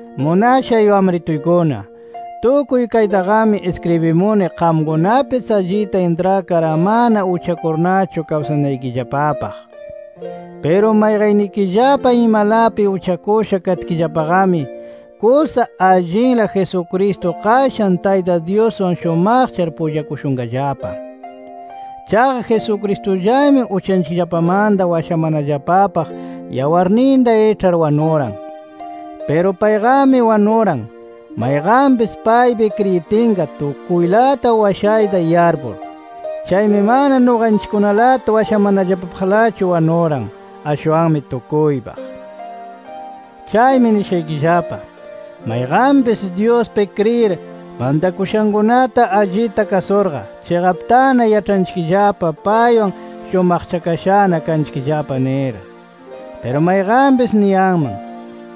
Munashay wamrituykuna, tukuy kaytaqami iskribimuni qamkunapis allita intrakar amana uchakurnachu kawsanaykillapapaq. Piru mayqannikillapa imalapi uchakusha katkillapaqami, kusa allinla Jesucristo qashan Tayta Dyuswan shumaqchar pullachashunqallapa. Chaqa Jesucristullami uchanchikllapamanta washamanallapapaq yawarninta iĉhar wanuran. Piru payqami wanuran, mayqanpis paypi kriyitinqa tukuylata washayta yarpur. Chaymi mana nuqanchikkunalata washamanallapapaqlachu wanuran, ashwanmi tukuypaq. Chaymi nishaykillapa: Mayqanpis Dyuspi kriyir, mantakushankunata allita kasurqa, chiqaptana yaĉhanchikllapa paywan shumaqchakashana kanchikllapa nir. Piru mayqanpis niyanman: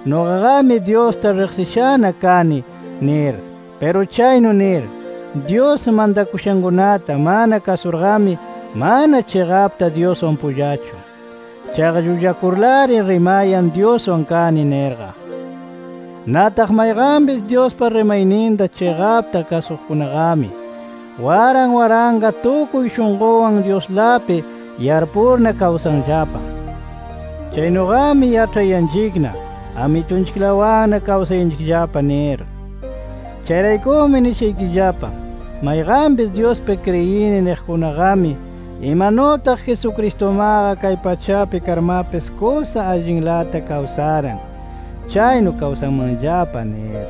Nuqaqami Dyusta riqsishana kani nir. Piru chaynu nir, Dyus mantakushankunata mana kasurqami, mana chiqapta Dyuswan pullachu. Chaqa llullakurlari rimayan Dyuswan kani nirqa. Nataq mayqanpis Dyuspa rimayninta chiqapta kasuqkunaqami, waran waranqa tukuy shunqunwan Dyuslapi yarpurna kawsanllapa. Chaynuqami, yaĉhayanchikna Amitunchiklawanna kawsanchikllapa nir. Chayraykumi nishaykillapa: Mayqanpis Dyuspi kriyini niqkunaqami, imanutaq Jesucristumaqa kay pachapi karmapis kusa allinlata kawsaran, chaynu kawsanmanllapa nir.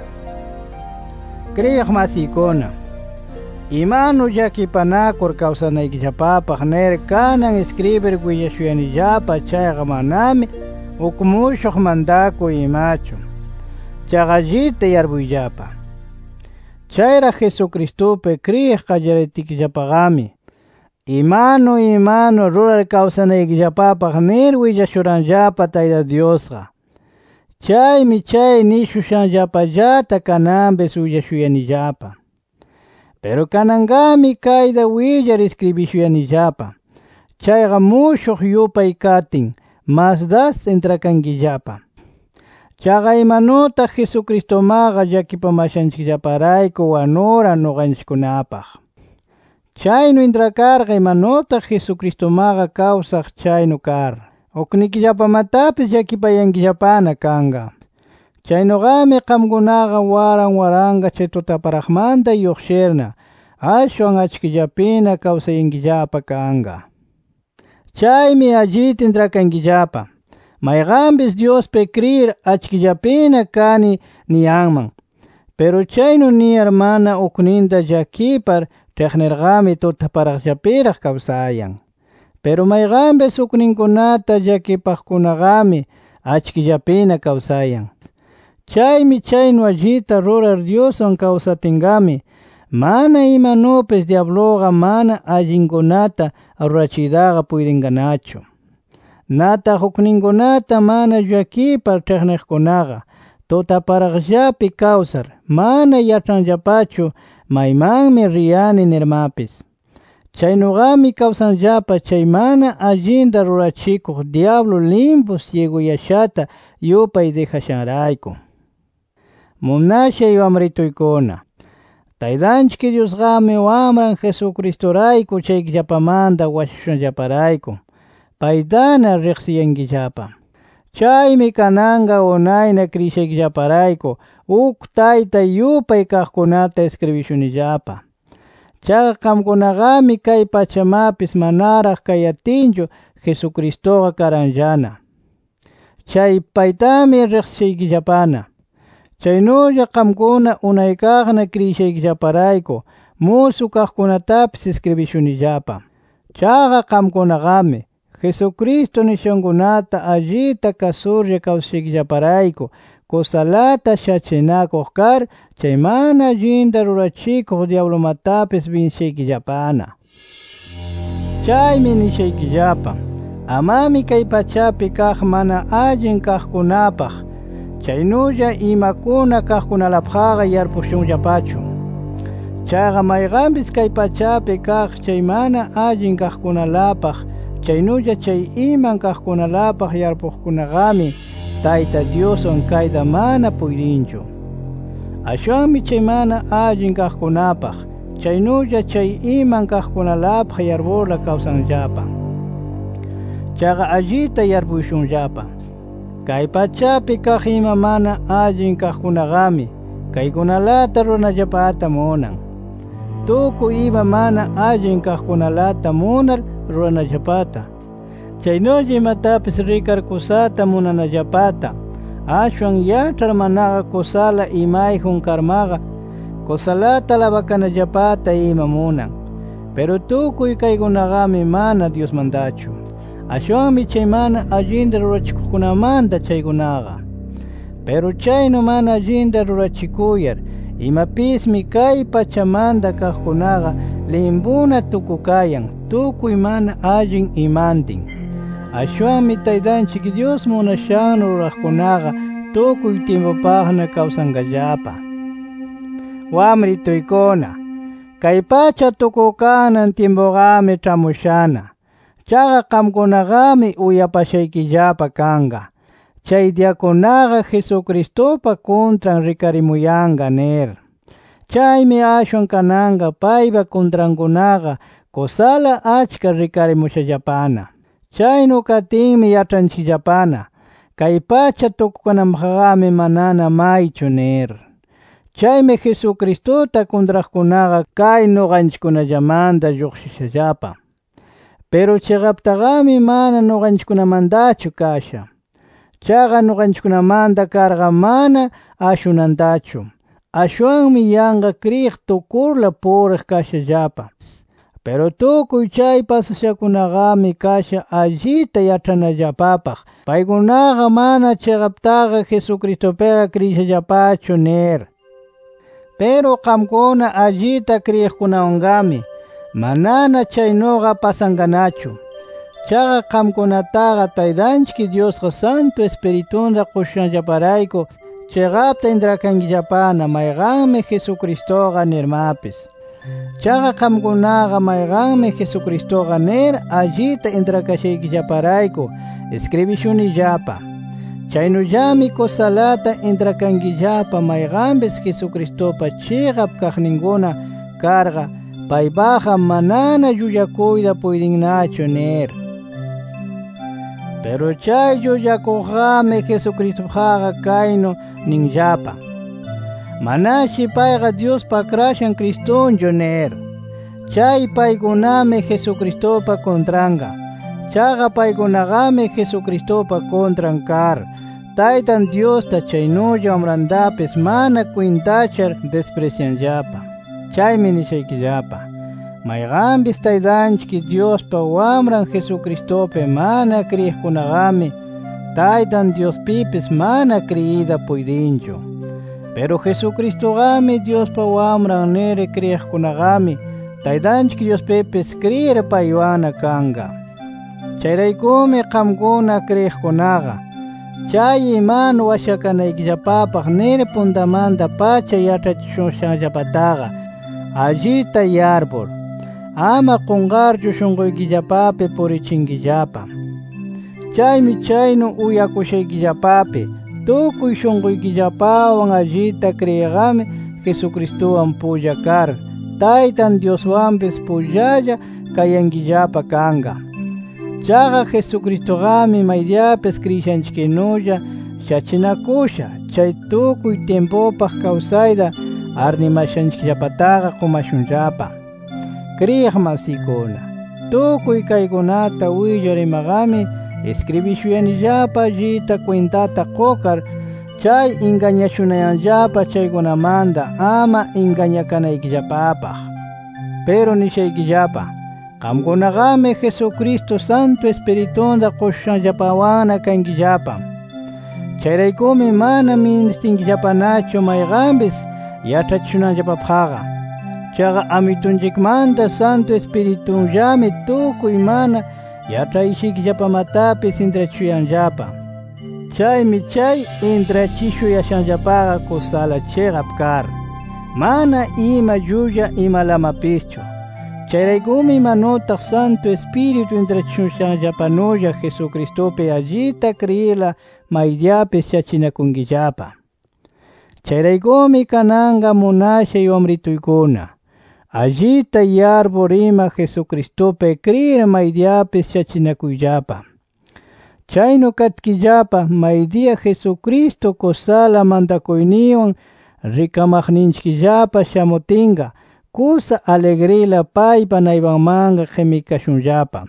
Kriyiq masiykuna, imanu llakipanakur kawsanaykillapapaq nir kanan iskribir willashuyanillapa chayqa manami uk mushuq mantakuy imachu. Chaqa allita yarpuyllapa: Chayraq Jesucristupi kriyiq qallaritkillapaqami, imanu imanu rurar kawsanaykillapapaq nir willashuranllapa Tayta Dyusqa. Chaymi chay nishushanllapallata kananpis willashuyanillapa. Piru kananqami, kayta willar iskribishuyanillapa chayqa mushuq yupay katin, mas das intrakankillapa. Chaqa imanutaq Jesucristumaqa llakipamashanchikllaparayku wanuran nuqanchikkunapaq. Chaynu intrakarqa imanutaq Jesucristumaqa kawsaq chaynu kar, uknikillapamatapis llakipayankillapana kanqa. Chaynuqami qamkunaqa waran waranqa chay tutaparaqmanta lluqshirna, ashwan achkillapina kawsayankillapa kanqa. Chaymi allita intrakankillapa: Mayqanpis Dyuspi kriyir, achkillapina kani niyanman. Piru chaynu niyar mana ukninta llakipar ĉhiqnirqami, tutaparaqllapiraq kawsayan. Piru mayqanpis ukninkunata llakipaqkunaqami achkillapina kawsayan. Chaymi chaynu allita rurar Dyuswan kawsatinqami, mana imanupis dyabluqa mana allinkunata rurachiytaqa puytinqanachu. Nataq ukninkunata mana llakipar ĉhiqniqkunaqa, tutaparaqllapi kawsar, mana yaĉhanllapachu maymanmi riyani nirmapis. Chaynuqami kawsanllapa chay mana allinta rurachikuq dyablu limpu syiguyashata yupay dijashanrayku. Munashay wamrituykuna, Taytanchik Dyusqami Wamran Jesucristurayku uchaykillapamanta washashushanllaparayku, paytana riqsishaykillapa. Chaymi kananqa unayna kriyishaykillaparayku uk tayta yupay kaqkunata iskribishunillapa. Chaqa qamkunaqami kay pachamapis manaraq kayatinchu Jesucristuqa karanllana, chay paytami riqsishaykillapana. Chaynulla qamkuna unaykaqna kriyishaykillaparayku musu kaqkunatapis iskribishunillapa. Chaqa qamkunaqami, Jesucristo nishankunata allita kasurlla kawsashaykillaparayku kusalata shachinakuq kar, chay mana allinta rurachikuq dyablumatapis binsishaykillapana. Chaymi nishaykillapa: Amami kay pachapi kaq mana allin kaqkunapaq, chaynulla imakuna kaqkunalapaqqa yarpushunllapachu. Chaqa mayqanpis kay pachapi kaq chay mana allin kaqkunalapaq, chaynulla chay iman kaqkunalapaq yarpuqkunaqami, Tayta Dyuswan kayta mana puytinchu. Ashwanmi chay mana allin kaqkunapaq, chaynulla chay iman kaqkunalapaq yarpurla kawsanllapa. Chaqa allita yarpushunllapa: Kay pachapi kaq ima mana allin kaqkunaqami kaykunalata ruranallapata munan. Tukuy ima mana allin kaqkunalata munar ruranallapata, chaynulla imatapis rikar kusata munanallapata, ashwan yaĉhar manaqa kusala imayjun karmaqa kusalata alabakanallapata ima munan. Piru tukuy kaykunaqami mana Dyusmantachu, ashwanmi chay mana allinta rurachikuqkunamanta chaykunaqa. Piru chaynu mana allinta rurachikuyar imapismi, kay pachamanta kaqkunaqa limpuna tukukayan tukuy mana allin imantin. Ashwanmi Taytanchik Dyus munashannu ruraqkunaqa, tukuy tyimpupaqna kawsanqallapa. Wamrituykuna, kay pacha tukukanan tyimpuqami ĉhamushana. Chaqa qamkunaqami, uyapashaykillapa kanqa, chay diyakunaqa, Jesucristupa kuntran rikarimuyanqa nir. Chaymi ashwan kananqa paypa kuntrankunaqa kusala achka rikarimushallapana. Chaynu katinmi, yaĉhanchikllapana kay pacha tukunanpaqqami, manana maychu nir. Chaymi Jesucristuta kuntraqkunaqa, kay nuqanchikkunallamanta lluqshishallapa. Piru chiqaptaqami mana nuqanchikkunamantachu kasha. Chaqa nuqanchikkunamanta karqa mana ashunantachu. Ashwanmi yanqa kriyiq tukurla puriq kashallapa. Piru tukuy chay pasashankunaqami, kasha allita yaĉhanallapapaq paykunaqa mana chiqaptaqa Jesucristupiqa kriyishallapachu nir. Piru qamkuna allita kriyiqkunawanqami, manana chaynuqa pasanqanachu. Chaqa qamkunataqa Taytanchik Dyusqa Santu Ispiritunta qushushanllaparayku chiqapta intrakankillapana mayqanmi Jesucristuqa nirmapis. Chaqa qamkunaqa mayqanmi Jesucristuqa nir allita intrakashaykillaparayku iskribishunillapa. Chaynullami kusalata intrakankillapa mayqanpis Jesucristupa chiqap kaqninkuna karqa, paypaqqa manana llullakuyta puytinnachu nir. Piru chay llullakuqqami, Jesucristupaqqa kaynu ninllapa: Manashi payqa Dyuspa Akrashan Cristunchu nir. Chay paykunami Jesucristupa kuntranqa. Chaqa paykunaqami Jesucristupa kuntran kar, Taytan Dyusta chaynulla Wamrantapis mana kwintachar disprisyanllapa. Chaymi nishaykillapa: Mayqanpis Taytanchik Dyuspa Wamran Jesucristupi mana kriyiqkunaqami, Taytan Dyuspipis mana kriyiyta puytinchu. Piru Jesucristuqami Dyuspa Wamran nir, kriyiqkunaqami Taytanchik Dyuspipis kriyir paywanna kanqa. Chayraykumi qamkuna kriyiqkunaqa, chay imanu washakanaykillapapaq nir puntamanta-pacha yaĉhachishushanllapataqa allita yarpur, ama qunqarchu shunquykillapapi purichinkillapa. Chaymi chaynu uyakushaykillapapi tukuy shunquykillapawan allita kriyiqqami, Jesucristuwan pulla kar, Taytan Dyuswanpis pullalla kayankillapa kanqa. Chaqa Jesucristuqami maydiyapis kriyishanchiknulla shachinakusha, chay tukuy tyimpupaq kawsayta arnimashanchikllapataqa qumashunllapa. Kriyiq masiykuna, tukuy kaykunata willar imaqami, iskribishuyanillapa allita kwintata qukar, chay ingañashunayanllapa chaykunamanta ama ingañakanaykillapapaq. Piru nishaykillapa: Qamkunaqami Jesucristo, Santu Ispiritunta qushushanllapawanna kankillapa. Chayraykumi mana ministinkillapanachu mayqanpis yaĉhachishunanllapapaqqa. Chaqa Amitunchikmanta Santu Ispiritunllami tukuy mana yaĉhashaykillapamatapis intrachishuyanllapa. Chaymi chay intrachishuyashanllapaqa kusala chiqap kar, mana ima llulla imalamapischu. Chayraykumi imanutaq Santu Ispiritu intrachishushanllapanulla Jesucristupi allita kriyirla maydiyapis shachinakunkillapa. Chayraykumi kananqa munashay wamrituykuna, allita yarpur ima Jesucristupi kriyir maydiyapis shachinakuyllapa. Chaynu katkillapa maydiya Jesucristo kusala mantakuyninwan rikamaqninchikllapa shamutinqa, kusa aligrila paypa naypanmanqa qimikashunllapa,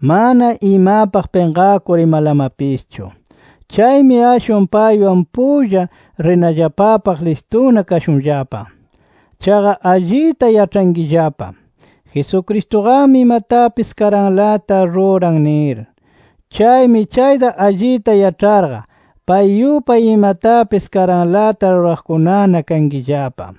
mana imapaq pinqakur imalamapischu. Chaymi ashwan paywan pulla rinallapapaq listuna kashunllapa. Chaqa allita yaĉhankillapa, Jesucristuqami imatapis karanlata ruran nir. Chaymi chayta allita yaĉharqa, pay yupay imatapis karanlata ruraqkunana kankillapa.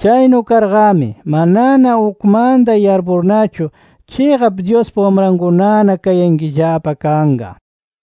Chaynu karqami, manana ukmanta yarpurnachu chiqap Dyuspa wamrankunana kayankillapa kanqa.